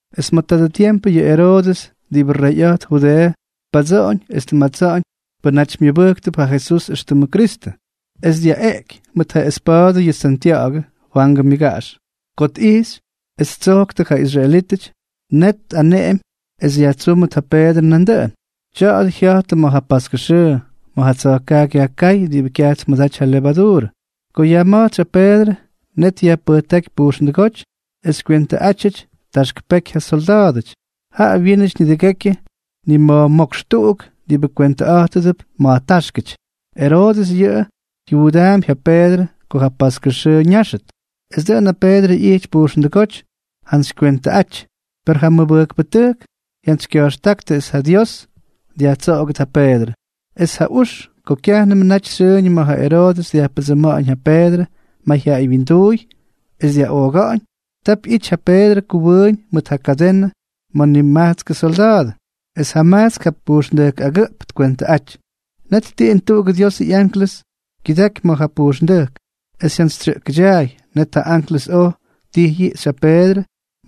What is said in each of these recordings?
Es ma̱ tadʉ tiempʉ yʉ Eroodʉs diꞌibʉ reyꞌa̱jt Judeeʉ, tpadsoꞌoñ es tmatsáñ pʉnaty myʉbʉjktʉp ja Jesús éxtʉmʉ Kristʉ, es dyaꞌeꞌky mʉt ja espa̱a̱dʉ yʉ Santya̱ꞌa̱gʉ, Fwangʉ myʉgaꞌax. Ko tꞌijxy es ttsojktʉ ja israelítʉty, net tꞌaneꞌemy es yajtsúmʉt ja Peedrʉ nandʉꞌʉn. Tya̱a̱dʉ jya̱jtʉ ma̱ ja paskʉ xʉʉ, ma̱ ja tsa̱jkaaky yajkáy diꞌibʉ kyaj tmʉdaty ja levaduurʉ. Ko yajma̱jtsy ja Peedrʉ, net yajpʉjtáky pujxndʉgóty es kywentʉꞌátyʉty taxk peky ja solda̱a̱dʉty. Ja wyínʉty nidʉgekyʉ nima̱jmókx tuꞌuk diꞌibʉ kwentʉꞌa̱jtʉdʉp ma̱jtaxkáty. Eroodʉs yʉꞌʉ jyuudaampy ja Peedrʉ ko ja paskʉ xʉʉ ñáxʉt. Es dʉꞌʉn ja Peedrʉ ꞌyijty pujxndʉgóty jantsykywentʉꞌaty, per ja mʉbʉjkpʉtʉjk jyantsykya̱jxtáktʉ es ja Dios dyajtsoꞌogʉt ja Peedrʉ. Es ja ux ko kyajnʉmʉ naty xyʉʉñʉ ma̱ ja Eroodʉs dyajpʉdsʉma̱ꞌa̱ñ ja Peedrʉ mayjyaꞌay wyinduuy es dyaꞌooga̱ꞌa̱ñ, tap ꞌyity ja Peedrʉ kʉwʉʉñ mʉt ja kadenʉ ma̱ nimajtskʉ solda̱a̱dʉ, es jamajtsk jap pujxndʉjk agʉꞌp tkwentʉꞌaty. Net tiꞌin tuꞌugʉ Diosʉ ꞌyanklʉs kyʉdaky ma̱ ja pujxndʉjk, es jyantsytyukja̱jʉtyaay. Net ja anklʉs oj ttijꞌyꞌiꞌxy ja Peedrʉ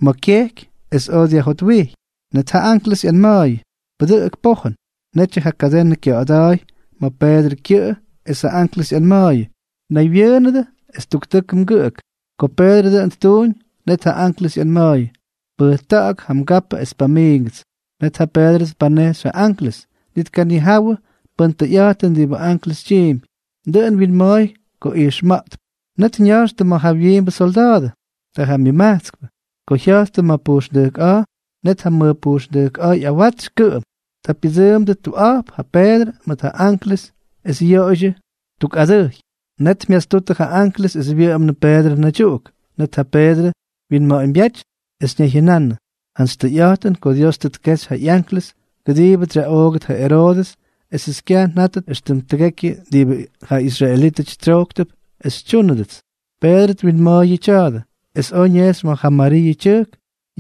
ma̱ kyejky es oj dyajjotwijy. Net ja anklʉs ꞌyanma̱a̱yʉ: —¡Pʉdʉꞌʉk pojʉn! Netyʉ ja kadenʉ kya̱ꞌa̱da̱a̱y ma̱ Peedrʉ kyʉꞌʉ, es ja anklʉs ꞌyanma̱a̱yʉ: —Naywyʉʉnʉdʉ es tuktʉkʉ mgʉꞌʉk. Ko Peedrʉ dʉꞌʉn ttuuñ, net ja anklʉs ꞌyanma̱a̱yʉ: —Pʉjta̱ꞌa̱k ja mgapʉ es pamiingʉts. Net ja Peedrʉ tpanejxy ja anklʉs, ni tkanijawʉ pʉn tʉyꞌa̱jtʉn diꞌibʉ anklʉs tyiimpy, dʉꞌʉn wyinma̱a̱y ko ijxma̱ꞌtp. Net ña̱jxtʉ ma̱ jawyiimbʉ solda̱a̱dʉ. Ta ja myʉmajtskpʉ. Ko jya̱jttʉ ma̱ pujxndʉjk a̱a̱, net ja mʉj pujxndʉjk a̱a̱ ꞌyawatsy kʉꞌʉm. Ta pyʉdsʉʉmdʉ tuꞌa̱jp ja Peedrʉ mʉt ja anklʉs es yoꞌoydyʉ tuk adʉjy. Net myastutʉ ja anklʉs es wyʉꞌʉmnʉ Peedrʉ naydyuꞌuk. Net ja Peedrʉ wyinma̱ꞌa̱ñbyáty, es ñayjyʉnanʉ: —Jantsy tʉyꞌa̱jtʉn ko Dios tʉ tkexy ja ꞌyanklʉs kʉdiibʉts xyaꞌoogʉt ja Eroodʉs esʉts kyaj njátʉt éxtʉm tʉgekyʉ diꞌibʉ ja israelítʉty tsyojktʉp es xytyúnʉdʉts. Peedrʉ twinma̱a̱y yʉ tya̱a̱dʉ, es oj ñejxy ma̱ ja Mariiʉ tyʉjk,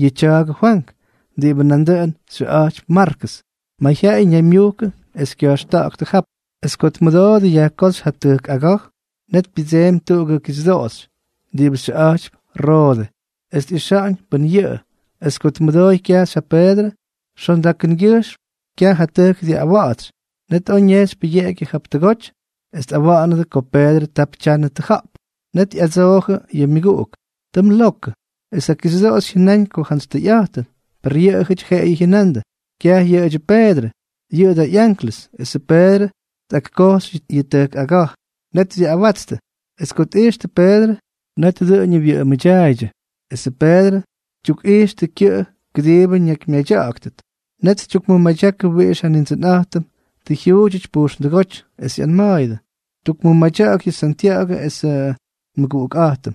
yʉ tya̱a̱gʉ Fwank diꞌibʉ nandʉꞌʉn xyʉꞌa̱jtypy Markʉs. Mayjyaꞌay ñaymyujkʉ es kya̱jxta̱ꞌa̱ktʉ jap. Es ko tmʉdoodʉ yajkóxy ja tʉjk aga̱j, net pyʉdseemy tuꞌugʉ kixyʉdoꞌoxy diꞌibʉ xyʉꞌa̱jtypy Roode, es tꞌixa̱ꞌa̱ñ pʉ́n yʉꞌʉ. Es ko tmʉdooy kyajxy ja Peedrʉ, xondakʉngyʉjxm kyaj ja tʉjk dyaꞌꞌawatsy. Net oj ñejxy pʉyeꞌegyʉ jap tʉgoty es tꞌawa̱ꞌa̱nʉdʉ ko Peedrʉ tap tyanʉ tʉja̱ꞌp. Net ꞌyadsoojʉ yʉ myʉguꞌuk: —Tʉ mlokʉ. Es ja kixyʉdoꞌoxy jyʉnáñ ko jantsy tʉyꞌa̱jtʉn. Per yʉꞌʉjʉty jeꞌeyʉ jyʉnandʉ: —Kyaj yʉꞌʉdyʉ Peedrʉ. Yʉꞌʉ da ꞌyanklʉs. Esʉ Peedrʉ tꞌakkoxy yʉ tʉjk aga̱j. Net dyaꞌꞌawatstʉ. Es ko tꞌijxtʉ Peedrʉ, net dʉꞌʉñʉ wyʉꞌʉmʉdyaaydyʉ. Esʉ Peedrʉ tyukꞌijxʉ kyʉꞌʉ kʉdiibʉ ñakymyadya̱ꞌa̱gʉt. Net ttukmʉmadyaktʉ wiꞌix ja Nindsʉnꞌa̱jtʉm tʉ jyuudyʉty pujxndʉgóty. Es ꞌyanma̱a̱yʉdʉ: —Tukmʉmadya̱ꞌa̱k yʉ Santya̱ꞌa̱gʉ esʉ nmʉguꞌukꞌa̱jtʉm.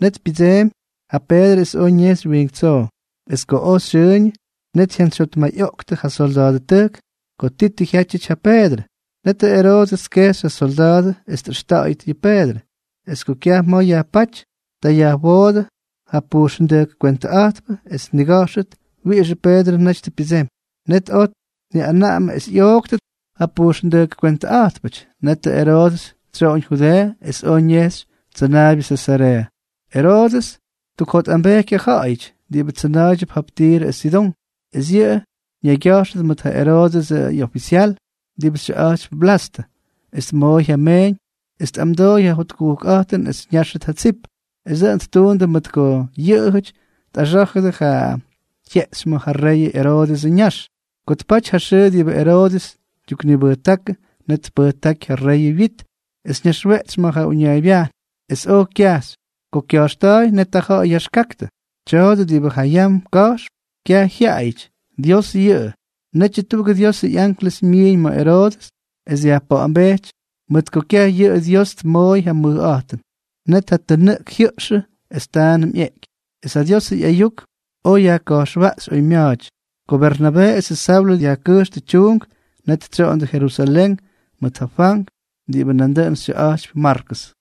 Net pyʉdseemy ja Peedrʉ es oj ñejxy wiink tsoo. Es ko oj xyʉʉñʉ, net jyantsyjyotmayꞌoꞌktʉ ja solda̱a̱dʉtʉjk ko ti tʉ jyátyʉty ja Peedrʉ. Netʉ Eroodʉs tkejxy ja solda̱a̱dʉ es tꞌʉxta̱ꞌa̱yʉt yʉ Peedrʉ. Es ko kyaj ma̱ yajpáty, ta yajwoodʉ ja pujxndʉjk kywentʉꞌa̱jtpʉ es tniga̱jxʉt wiꞌixʉ Peedrʉ naty tʉ pyʉdsemy. Net oj tniꞌaneꞌemy es ꞌyooktʉt ja pujxndʉjk kwentʉꞌa̱jtpʉty. Netʉ Eroodʉs tsyoꞌoñ Judeeʉ es oj ñejxy tsʉnaabyʉ Sesareeʉ. Eroodʉs ttukjotꞌambejky ja ja̱ꞌa̱yʉty diꞌibʉ tsʉna̱a̱ydyʉp jap Tirʉ es Sidón. Es yʉꞌʉ ñaygya̱jxʉdʉ mʉt ja Eroodʉsʉ ꞌyofisyal diꞌibʉ xyʉꞌa̱jtypy Blastʉ, es tmooy ja meeñ es tꞌamdooy ja jotkujkꞌa̱jtʉn es ñáxʉt ja tsip. Es dʉꞌʉn ttuundʉ mʉt ko yʉꞌʉjʉty tꞌaxá̱jʉdʉ ja jyeꞌxy ma̱ ja rey Eroodʉsʉ ñax. Ko tpaty ja xʉʉ diꞌibʉ Eroodʉs tyuknibʉjtákʉ, net tpʉjtáky ja rey wyit, es ñaxweꞌtsy ma̱ ja uñaaybyajn, es oj kyajxy. Ko kya̱jxta̱a̱y, net ja ja̱ꞌa̱y yaxkaktʉ: —¡Tya̱a̱dʉ diꞌibʉ ja yam ka̱jxp, kyaj jyaꞌayʉty! ¡Dios yʉꞌʉ! Netyʉ tuꞌugʉ Diosʉ ꞌyanklʉs myiiñ ma̱ Eroodʉs es dyajpa̱ꞌa̱mbejty mʉt ko kyaj yʉꞌʉ Dios tmooy ja mʉjꞌa̱jtʉn. Net ja tʉnʉꞌk jyʉꞌxʉ es taanʉm ꞌyeꞌky. Es ja Diosʉ ꞌyayuk oj yajka̱jxwaꞌxy oymya̱a̱ty. Ko Bernabee esʉ Saulʉ dyajkʉjxtʉ tyuunk, net tsyoꞌondʉ Jerusalén mʉt ja Fwank diꞌibʉ nandʉꞌʉn xyʉꞌa̱jtypy Markʉs.